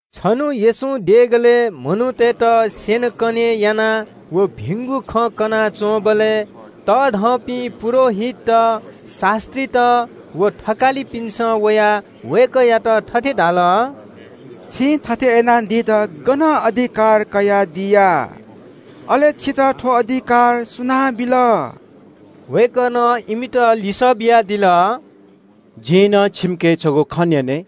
छन्‍हु येशूं देगलय् मनूतय्‌त स्‍यनेकने याना व भिंगु खँ कनाच्‍वंबलय् तःधंपिं पुजाहारीत, शास्‍त्रीत व थकालिपिन्‍सं वयाः वय्‌कःयात थथे धाल – “छिं थथे याना दित गनं अधिकार कयादिया? अले छितः थ्‍व अधिकार सुनां बिल?” वय्‌कलं इमित लिसः बियादिल – “जिं नं छिकपिन्‍के छगू खँ न्‍यने –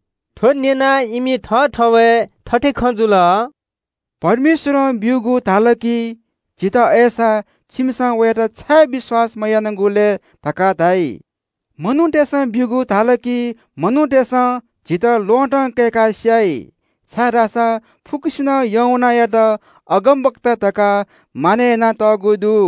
थ्‍व न्‍यनाः इमि थःथवय् थथे खँ जुल – “स्‍वर्गपाखें काःगु धाल कि झन झीत वं ‘अय्‌सा, छिमिसं वयात छाय् विश्‍वास मयानागु लय्?’ धकाः धाइ। मनूतय्‌पाखें काःगु धाल कि मनूतय्‌सं झीत ल्‍वहँतं कय्‌का स्‍याइ, छाय्‌धाःसा फुक्‍कसिनं यूहन्‍नायात अगमवक्ता धकाः मानय् यानातःगु दु।”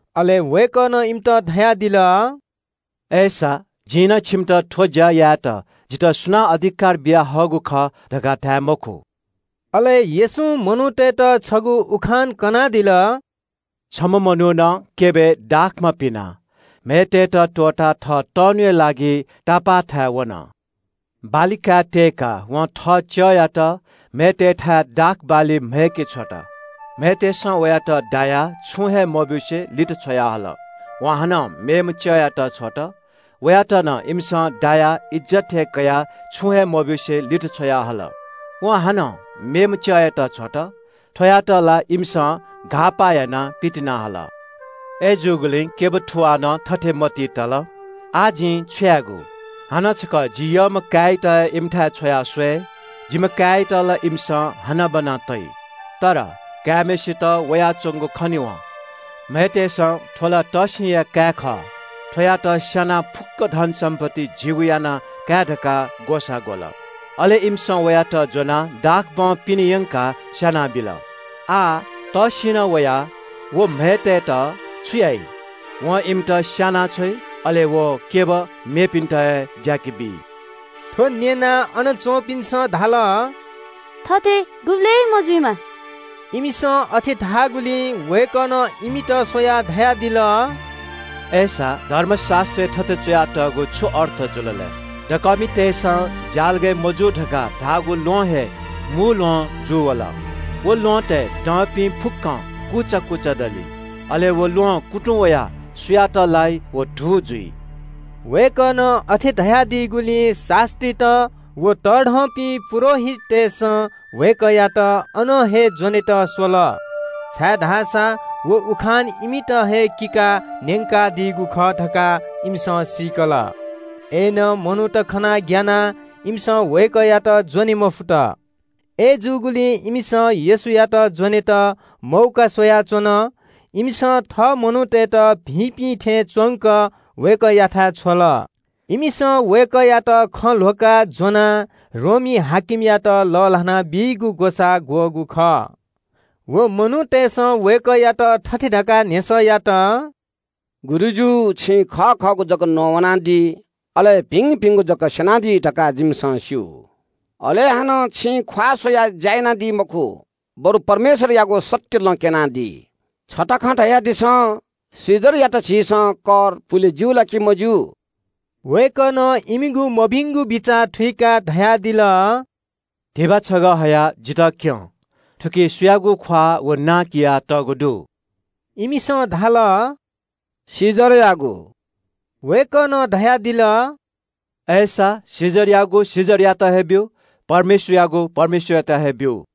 अले वय्‌कलं इमित धयादिल – “अय्‌सा, जिं नं छिकपिन्‍त थ्‍व ज्‍या यायेत जितः सुनां अधिकार बियाहःगु खः धकाः धाये मखु।” अले येशूं मनूतय्‌त छगू उखान कनादिल – “छम्‍ह मनुखं क्‍यबय् दाखमा पिनाः म्‍हय्‌तय्‌त त्‍वःताः थः तःन्‍हुया लागि तापालय् वन। बाली काय् त्‍यय्‌काः वं थः च्‍यःयात म्‍हय्‌तय्‌थाय् दाख बाली काय्‌के छ्वल। म्‍हय्‌तय्‌सं वयात दायाः छुं हे मब्‍यूसे लित छ्वयाहल। वं हानं मेम्‍ह च्‍यःयात छ्वल। वयात नं इमिसं दायाः इज्‍जत हे कयाः छुं हे मब्‍यूसे लित छ्वयाहल। वं हानं मेम्‍ह च्‍यःयात छ्वल। थ्‍वयात ला इमिसं घाःपाः यानाः क्‍यबं पितिना हल। “अय्‌जूगुलिं क्‍यब थुवालं थथे मतिइ तल – ‘आः जिं छु यायेगु? हानं छकः जि यःम्‍ह काय्‌यात हे इमिथाय् छ्वया स्‍वये, जिम्‍ह काय्‌यात ला इमिसं हनाबना तइ।’ “अय्‌नं काय्‌म्‍हय्‌सित वयाच्‍वंगु खनेवं म्‍हय्‌तय्‌सं – ‘थ्‍व ला तःसिंया काय् खः, थ्‍वयात स्‍यानाः फुक्‍क धनसम्‍पत्ति झीगु याना काये धकाः ग्‍वसाः ग्‍वल।’ अले इमिसं वयात ज्‍वनाः दाखक्‍यबं पिने यंकाः स्‍यानाबिल। “आः तःसिंनं वयाः व म्‍हय्‌तय्‌त छु याइ? वं इमित स्‍यानाछ्वइ, अले व क्‍यब मेपिन्‍त हे ज्‍याके बी।” थ्‍व न्‍यनाः अन च्‍वंपिन्‍सं धाल – “थथे गुबलें मजुइमा।” इमिसं अथे धाःगुलिं वय्‌कलं इमित स्‍वयाः धयादिल – “अय्‌सा धर्मशास्‍त्रय् थथे च्‍वया तःगुया छु अर्थ जुल लय्? “‘दकःमितय्‌सं ज्‍यालगय् मजूगु धकाः धाःगु ल्‍वहं हे मू ल्‍वहं जूवल।’ “व ल्‍वहँतय् दःपिं फुक्‍कं कुचा कुचा दली। अले व ल्‍वहं कुतुं वयाः सुयात लाइ व धू जुइ।” वय्‌कलं अथे धयादीगुलिं शास्‍त्रीत व तःधंपिं पुजाहारीतय्‌सं वय्‌कःयात अन हे ज्‍वनेत स्‍वल, छाय्‌धाःसा व उखान इमित हे किकाः न्‍यंकादीगु खः धकाः इमिसं सीकल। अय्‌नं मनूत खनाः ग्‍यानाः इमिसं वय्‌कःयात ज्‍वने मफुत। अय्‌जूगुलिं इमिसं येशूयात ज्‍वनेत मौका स्‍वयाच्‍वन। इमिसं थः मनूतय्‌त भिंपिं थें च्‍वंक वय्‌कःयाथाय् छ्वल। इमिसं वय्‌कःयात खँ ल्‍ह्वकाः ज्‍वनाः रोमी हाकिमयात लःल्‍हाना बीगु ग्‍वसाः ग्‍वःगु खः। व मनूतय्‌सं वय्‌कःयात थथे धकाः न्‍ह्यसः यात – “गुरुजु, छिं खः खःगु जक नवानादी, अले भिंभिंगु जक स्‍यनादी धकाः जिमिसं स्‍यू। अले हानं छिं ख्‍वाः स्‍वयाः ज्‍या यानादी मखु, बरु परमेश्‍वरयागु सत्‍य लँ क्‍यनादी। छता खँ धयादिसँ, कैसरयात झीसं कर पुले ज्‍यू ला कि मज्‍यू?” वय्‌कलं इमिगु मभिंगु बिचाः थुइकाः धयादिल – “धिबा छगः हयाः जितः क्‍यनादिसँ। थुकी सुयागु ख्‍वाः व नां कियातःगु दु?” इमिसं धाल – “कैसरयागु।” वय्‌कलं धयादिल – “अय्‌सा कैसरयागु कैसरयात हे बीमाः, परमेश्‍वरयागु परमेश्‍वरयात हे बीमाः।”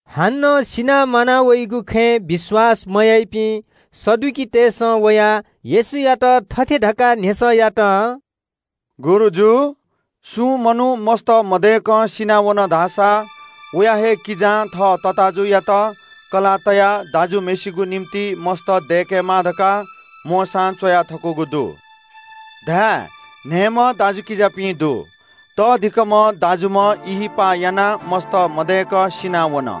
हानं सिनाः म्‍वाना वइगु खँय् विश्‍वास मयाइपिं सदुकीतय्‌सं वयाः येशूयात थथे धकाः न्‍ह्यसः यात – “गुरुजु, सुं मनू मस्‍त मदय्‌कं सिनावन धाःसा वया हे किजां थः तताःजुयात कलाः तयाः दाजुम्‍हय्‌सिगु निंतिं मस्‍त दय्‌केमाः धकाः मोशां च्‍वया थकूगु दु। धाये – न्‍हय्‌म्‍ह दाजुकिजापिं दु। तःधिकःम्‍ह दाजुम्‍ह ब्‍याहा यानाः मस्‍त मदय्‌क सिनावन।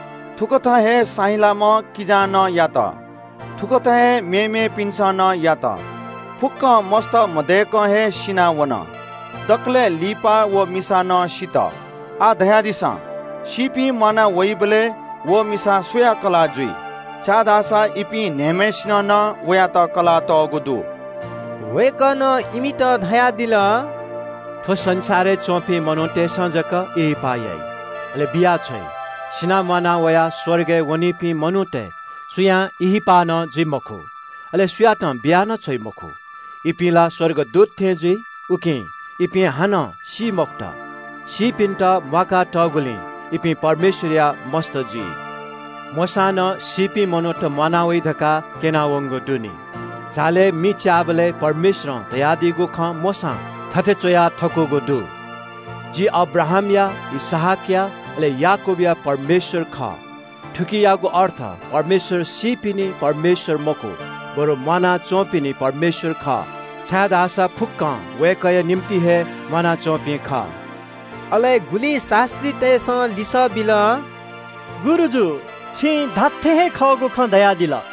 थुकथं हे साहिँलाम्‍ह किजां नं यात। थुकथं हे मेमेपिन्‍सं नं यात। फुक्‍कं मस्‍त मदय्‌कं हे सिनावन। दकलय् लिपा व मिसा नं सित। आः धयादिसँ, सीपिं म्‍वाना वइबलय् व मिसा सुया कलाः जुइ? इपिं न्‍हय्‌म्‍हय्‌सिनं नं वयात कलाः तःगु दु।” वय्‌कलं इमित धयादिल – “थ्‍व संसारय् च्‍वंपिं मनूतय्‌सं जक ब्‍याहा याइ, अले बियाछ्वइ। सिनाः म्‍वाना वयाः स्‍वर्गय् वनीपिं मनूतय् सुयां ब्‍याहा नं जुइ मखु। अले सुयातं बिया नं छ्वइ मखु। इपिं ला स्‍वर्गदूत थें जुइ, उकिं इपिं हानं सी मखुत। सीपिन्‍त म्‍वाका तःगुलिं इपिं परमेश्‍वरया मस्‍त जुइ। “मोशां नं सीपिं मनूत म्‍वाना वइ धकाः क्‍यना वंगु दु नि। झालय् मि च्‍याःबलय् परमेश्‍वरं धयादीगु खँ मोशां थथे च्‍वया थकूगु दु – ‘जि अब्राहाम, इसहाक व याकूबया परमेश्‍वर खः।’ थुकियागु अर्थ परमेश्‍वर सीपिनि परमेश्‍वर मखु, बरु म्‍वाना च्‍वंपिनि परमेश्‍वर खः, छाय्‌धाःसा फुक्‍कं वय्‌कःया निंतिं हे म्‍वानाच्‍वंपिं खः।” अले गुलिं शास्‍त्रीतय्‌सं लिसः बिल – “गुरुजु, छिं धात्‍थें हे खःगु खँ धयादिल।”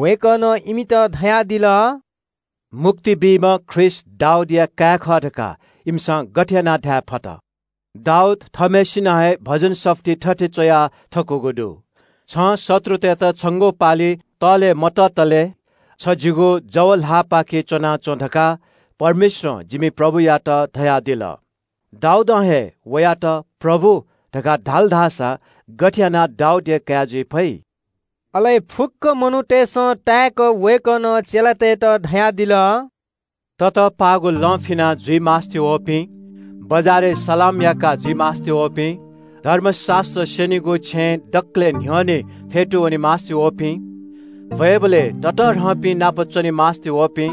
वय्‌कलं इमित धयादिल – “मुक्ति बीम्‍ह ख्रीष्‍ट दाऊदया काय् खः धकाः इमिसं गथे यानाः धायेफत? दाऊद थःम्‍हय्‌सिनं हे भजन सफुलिइ थथे च्‍वया थकूगु दु – “‘छं शत्रुतय्‌त छंगु पालि तःले मततले छ जिगु जव ल्‍हाःपाखे च्‍वनाच्‍वँ धकाः परमप्रभुं जिमि प्रभुयात धयादिल।’ “दाऊदं हे वयात ‘प्रभु’ धकाः धाल धाःसा गथे यानाः दाऊदया काय् जुइ फइ?” अले फुक्‍क मनूतय्‌सं ताय्‌क वय्‌कलं चेलातय्‌त धयादिल – “ततःपाःगु लं फिना जुइ मास्‍ति वःपिं, बजारय् मनूतय्‌सं मानय् याका जुइ मास्‍ति वःपिं, धर्मशास्‍त्र स्‍यनीगु छेँय् दकलय् न्‍ह्यःने फ्‍यतू वने मास्‍ति वःपिं, भ्‍वय्‌बलय् ततःधंपिं नाप च्‍वने मास्‍ति वःपिं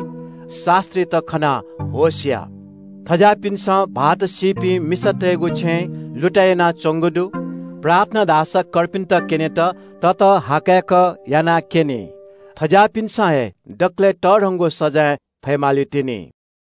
शास्‍त्रीत खनाः होश या। थज्‍याःपिन्‍सं भाःत मदुपिं मिसातय्‌गु छेँ लुतय् यानाच्‍वंगु दु, प्रार्थना धाःसा कर्पिन्‍त क्‍यनेत ततःहाकय्‌क यानाक्‍यनी। थज्‍याःपिन्‍सं हे दकलय् तःधंगु सजाँय फये मालीतिनि।”